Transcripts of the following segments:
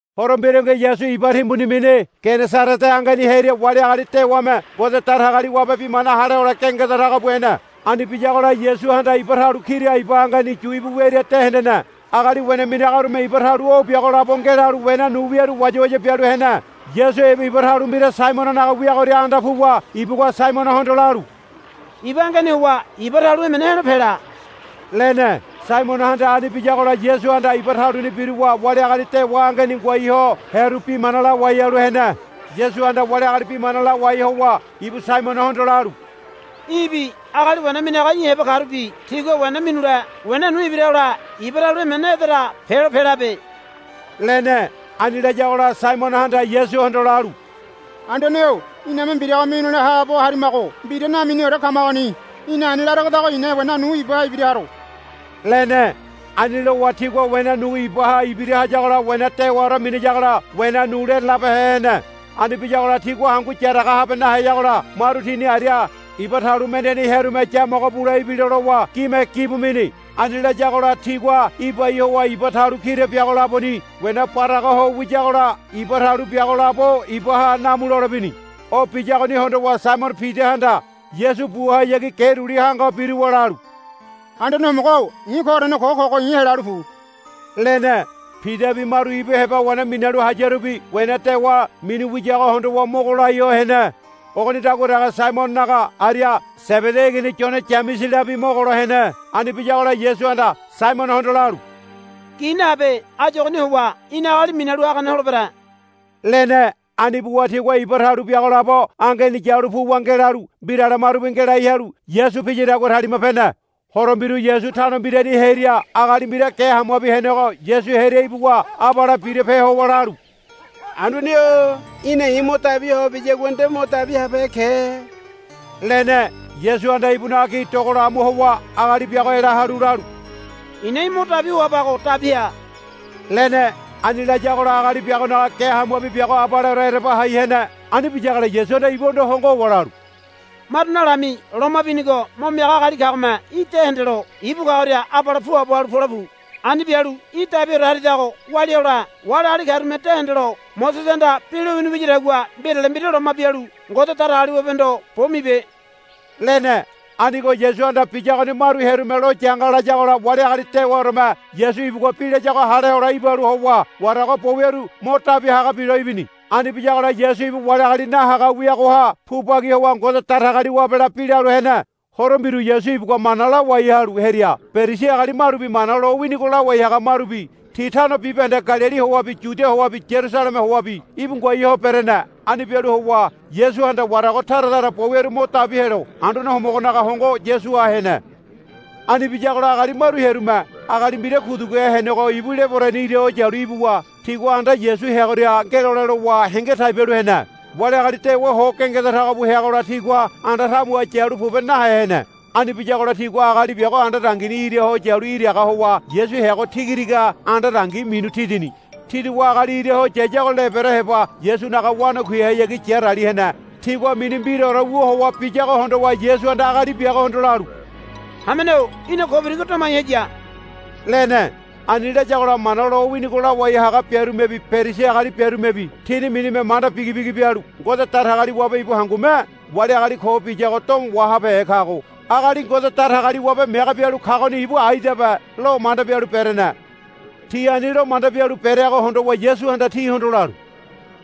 Horo mbirungi Yasu iba timbuni mini Genesarete angeni hearia wali agali dewame Ngode Datagaliwabe bi mana hale hole gengeda tago bu hene. Ani biyagola Yasuhanda iba talu kira iba angeni yu íbu wiaria de hendene. Agali wena minagarume iba talu o biago labo ngelalu wena nu wiaru wayawaya bialu hene. Yasu ibu iba talu mbira Saimononaga wiagoria anda puwa ibugua Saimonohondo lalu, Iba angeni howa iba talu emene he̱lo pela, lene. Saimonohanda ani biyagola Yasuhanda iba taluni biruwa wali agali dewa angeni ngoai ho hearu bi mana lawai halu hene. Yasuhanda wali agali bi mana lawai howa ibu Saimonohondo lalu, Í̠bi agali wena minaga í̠ heba karubi tígua wena minule wena nu ibira hole iba talu emene edera pelo pelabe, lene. Ani layagola Saimonohanda Yasuhondo lalu, Anduane-o iname mbiraga minule haabo harimago mbira naminiore kamagoni. Í̠na ani laregodago i̱na wena nu ibaha ibira haro, lene. Ani lowa tigua wena nu ibaha ibira hayagola wena dewaore miyagola wena nu lerelabehe hene. Ani biyagola tigua hangu yaraga nahabeheyagola maru tini aria iba talu mendeni hearume yamogo bule ibilo lowa gime gibu mini. Ani layagola tigua ibai howa iba talu kira biago laboni wena baraga ho wiyagola iba talu biago labo ibaha namu lole bini. O biyagoni hondowa Saimono Pidahanda Yasu buhayagi ge duli hanga ho biruwa lalu, Anduane Homogo-o i̱ koorene ko kogo i̱ helalu pu, lene. Pidabi maru ibu heba wena minalu hayarubi wena dewa minu wiyago hondowa mogo lai ho hene. Ogonidagua dege Saimononaga aria Sebedi igini Yone Yameselabi mogolo hene. Ani biyagola Yasuhanda Saimonohondo lalu, Gi nahabe. Áyu ogoni howa í̠na agali minalu hagane holebere, lene. Ani buwa tigua iba talu biago labo angeni yalu puwa ngelalu mbirale marubi ngelai halu Yasu piyadagua talima pene. Horo mbiru Yasu tano mbirani hearia agali mbira ge hamuabi henego Yasu hearia ibuwa abale birape howa lalu, Anduane-o í̠na i̱ mo dabi hoa biyagua nde mo dabi habehe ke, lene. Yasuhanda ibunaga gi dogola amu howa agali biago ela halu lalu, I̱na í̠ mo dabi hoabago dabi ha, lene. Ani layagola agali biagonaga ge hamuabi biago abaleore ereba hai hene. Ani biyagola Yasuhanda ibuhondo hongo howa lalu, Maru nalami loma binigo mo miaga agali kagome í̠ de hendelo ibu kagoria abale puabo halu pole pu. Ani bialu í̠ dabiore haridago walia hole wali agali karume de hendelo Mosesehanda bi lowini wiyadagua mbirale mbira loma bialu Ngode Datagaliwabehondo bo mibe, lene. Anigo Yasuhanda biyagoni maru hearume lo yanga layagola wali agali dewaoreme Yasu ibugua bi layago hale hole ibalu howa warago bo wiaru mo dabi haga bilo ibini. Ani biyagola Yasu ibu wali agali nahaga wiagoha pu bagi howa Ngode Datagaliwabela bi lalu hene. Horo mbiru Yasu ibugua mana lawai halu hearia Perisi agali marubi Mana lowinigo lawai haga marubi ti tano bibahende Galili howabi Yudia howabi Yarusaleme howabi íbu ngoai ho berene. Ani bialu howa Yasuhanda warago tara tara bo wiaru mo dabi helo Anduane Homogonaga hongo Yasuha hene. Ani biyagola agali maru hearume agali mbira kuduguhe henego ibu lebereni ira ho yalu ibuwa tigua anda Yasu heagoria ngelole lowa henge tai bialu hene. Wali agali dewa ho gengeda tago bu heagola tigua anda tamuha yalu pobe nahe hene. Ani biyagola tigua agali biago anda dangini ira ho yalu iraga howa Yasu heago tigatiga anda dangi minu tidini. Tiduwa agali ira ho yayago lebere heba Yasunaga wanakuihayagi yarali hene. Tigua mini mbiraore wu howa biyago hondowa Yasuhanda agali biagohondo lalu, Hamene-o í̠na ko birigo domai haya, lene. Ani layagola Mana lowinigo lawai haga biarumebi Perisi agali biarumebi tini minime manda bigi bigi bialu, Ngode Datagaliwabe ibu hangume wali agali ko biyago domo wahabehe kago. Agali Ngode Datagaliwabe mege bialu kagoni ibu aidabe, lomanda bialu berene. Ti ani lomanda bialu bereago hondowa Yasuhanda tihondo lalu,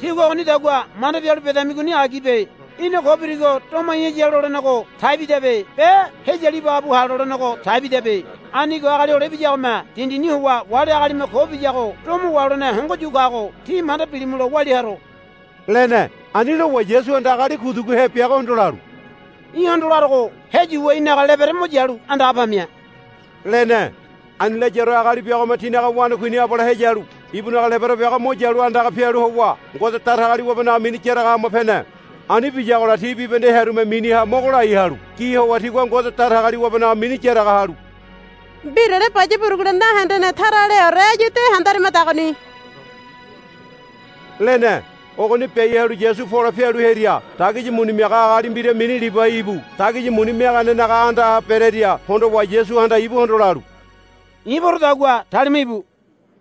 Tígua ogonidagua manda bialu bedamigoni agibe. Í̠na ko birigo domai haya, lolenego tai bidabe be, Heyalu ibaga bu ha, lolenego tai bidabe. Anigo Agali Hole Ibiyagome dindini howa wali agalime ko biyago domo waholene hongo yu kago tí manda bilimulo walia haro, lene. Ani lowa Yasuhanda agali kuduguhe biagohondo lalu, Í̠hondo larogo. Heyuwa í̠naga lebere mo yalu andaga pamia, lene. Ani layaore agali biagome tinaga wanakuini abale heyalu ibunaga lebere biago mo yalu andaga pialu howa Ngode Datagaliwabenaga mini yaraga hama pene. Ani biyagola ti bibahende hearume miniha mogo lai halu gi howa tigua Ngode Datagaliwabenaga mini yaraga halu, Mbirale baya burugule nahende tara aleore áyu de handarimadagoni, lene. Ogoni biai halu Yasu pole pialu hearia dagisi muni miaga agali mbira mini Libai ibu dagisi muni miaganenaga andaha berearia hondowa Yasuhanda ibuhondo lalu, I̱ porodagua talima íbu,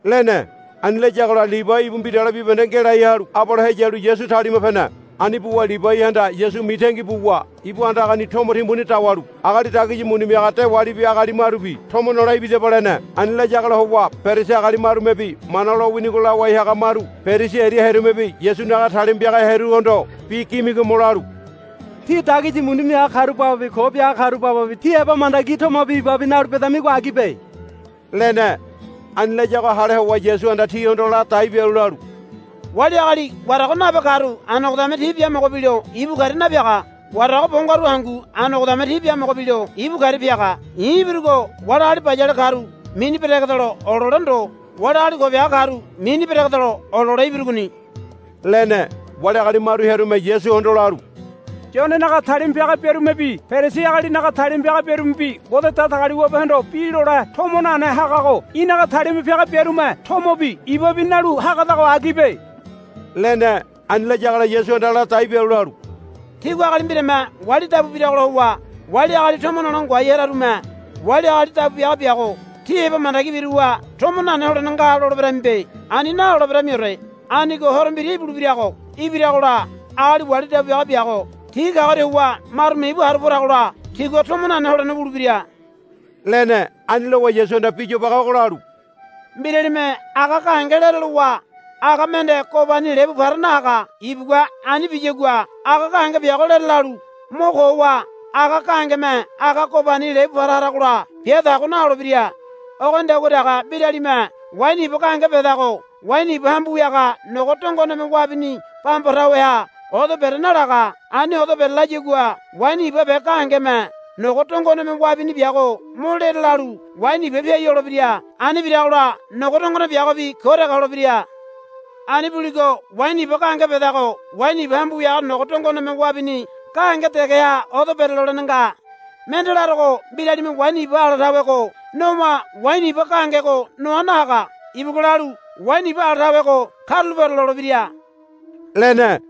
lene. Ani layagola Libai ibu mbirale bibahende ngelai halu abale heyalu Yasu talima pene. Ani buwa Libaihanda Yasu mitangi buwa ibu andagani tomo timbuni dawalu agali dagisi muni miaga dewalibi agali marubi, Tomo nole ibidaba, lene. Ani layagola howa Perisi agali marumebi Mana lowinigo lawai haga maru Perisi aria hearumebi Yasunaga talima piaga hearuhondo bi gimigomo lalu, Tí dagisi muni miaga karu bababi ko biaga karu bababi ti heba mandagi tomobi ibabi nalu bedamigo agibe, lene. Ani layago hale howa Yasuhanda tihondo ladai bialu lalu, Wali agali warago nabe karu anogodame ti biamogo bilo ibu karia napiaga. Warago bo ngaru hangu anogodame ti biamogo bilo ibu karia piaga. I̱ ibirugo wali agali bayale karu mini beregedelo olole ndo wali agali ko biaga karu mini beregedelo olole ibirugoni, lene. Wali agali maru hearume Yasuhondo lalu, Yonenaga talima piaga biarumebi Perisi agalinaga talima piaga biarumebi Ngode Datagaliwabehondo bi lole tomo nane hagago í̠naga talima piaga biarume tomobi ibabi nalu hagadago agibe, lene. Ani layagola Yasuhanda ladai bialu lalu, Tígua agali mbirame wali dabu biragola howa wali agali tomo nole ngoai hararume agali wali dabu biaga biago ti heba mandagi biruwa tomo nane holene nga loleberamibe. Ani naloleberamiore. Anigo horo mbira ibulebirago ibiragola agali wali dabu biaga biago ti kagoria howa marume ibu haru poragola tigua tomo nane holene wulebira, lene. Ani lowa Yasuhanda bi yobage ogo lalu, Mbiralime aga gahenge lere lowa aga mende gobani lebu para nahaga. Ibugua ani biyagua aga gahenge biago lere lalu mo ko howa aga gahengeme aga gobani lebu para haragola bia tago naholebira. Ogonidagua dege mbiralime waini iba gahenge bedago waini iba hambu wiaga nogo dongoneme wabini bamba taweha odo bere nalaga. Ani odo bere layagua waini iba gahengeme nogo dongoneme wabini biago mo lere lalu waini iba piai holebira. Ani biragola nogo dongone biagobi ko dege holebira. Ani buligo waini iba gahenge bedago waini iba hambu wiaga nogo dongoneme wabini gahenge degeha odo bere lolene nga. Mende larogo mbiralime waini iba ala tawego nowa waini iba gahengego noa nahaga. Ibugua lalu, Waini iba ala tawego karulapeore, lolebira, lene.